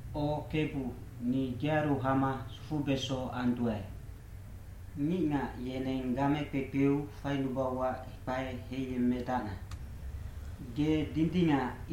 O Kebu, ni gearu hama sufubeso anduae. Ngicngac yeneng game kpekpeu fainubauac kpae heiyemmedacna. Ge dindingac,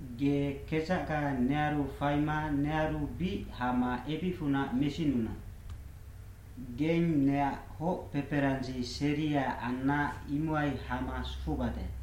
Ge kedzacga nearu faima nearu bic hama ebicfunac mesinuna. Geng neac hoc peperandzi seria anna imohai hama sufubade.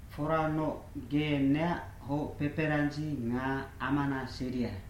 Foranoc, ge neac hoc peperandzi nga amana seria.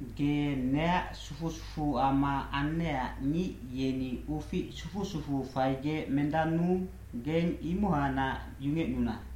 Ge neac sufu sufuama annecac ngic yeni ufic sufu sufuu faigec mendannuu, geng imohacnac yungecnuna.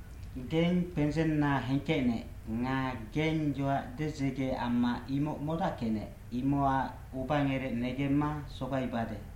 Geng kpendzenna hengkecnec nga geng yoac dedzege amma imoc modackecnec, imocac ubangerec negemma sogaibade.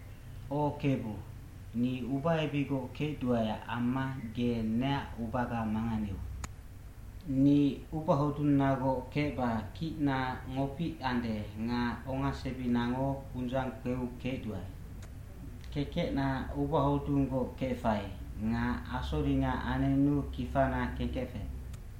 O Kebu, ni ubaebicgoc kecduaeac amma ge neac ubaga manganeu. Ni ubahodunnagoc kecba kicna ngopic ande nga ongasebinango undzang kpeu kecduae. Kekecna ubahodunggoc kefai nga asoringa anenu kifana kengkefec.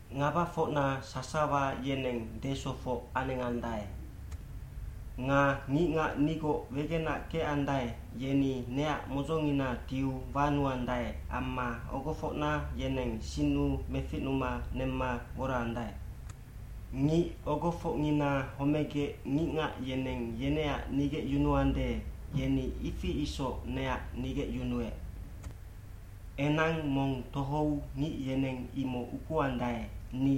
Ngabafocna sasawa yeneng desofoc anengandae. Nga ngicngac nigoc wegenac kecandae, yeni neac modzongina tiu wanuandae amma ogofocna yeneng sinnu meficnuma nemma woraandae. Ngic ogofocngina homegec ngicngac yeneng yeneac nigecyunuande, yeni ifi isoc neac nigecyunuec. Enang mong tohou ngic yeneng imoc ukuandae,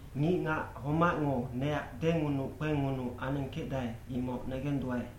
Ngicngac homacngo neac dengunuc kpengunuc anengkecdae imoc negenduae.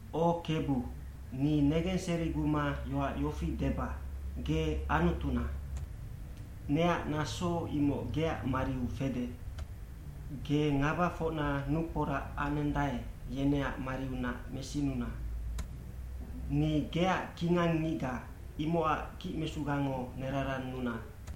O Kebu, ni negenseriguma yoac yofi deba, “Ge Anutuna.” Neac naso imoc geac mariu fede. Ge ngabafocna nukporac anendae, yeneac mariunac mesinuna. Ni geac kingang ngicga, imocac kicmesugango nerarannuna.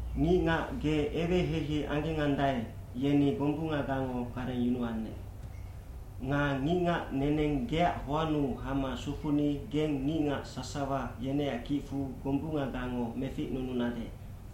Ngicngac ge eweheihei anggendae, yeni gombungagango garengyunuannec. Nga ngicngac neneng geac hoannu hama sufuni geng ngicngac sasawa yeneac kicfu gombunggango meficnununade,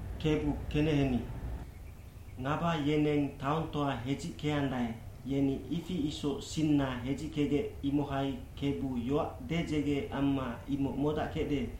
Kebu keneheni. Ngaba yeneng taongtoa hedzickeandae, yeni ifi isoc sinna hedzikegec imohai Kebu yoac dedzege amma imoc modackecde,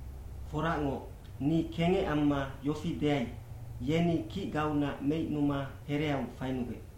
Foracngoc, ni kengec amma yofi deai, “Yeni kicgaunac meicnuma hereau fainugec.”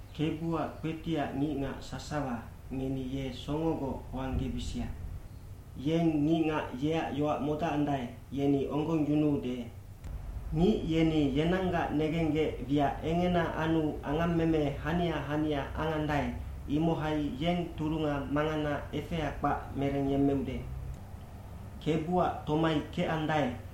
Kebuac kpetiac ngicngac sasawa, ngeni ye songogoc hoanggebisia. Yeng ngicngac yeac yoac modacandae, yeni onggongyunuude. Ngic yeni yenanggac negenggec wiac engena anu angammeme hania hania angandae, imohai yeng turunga mangana efea kpac merengyemmeude. Kebuac tomai kecandae,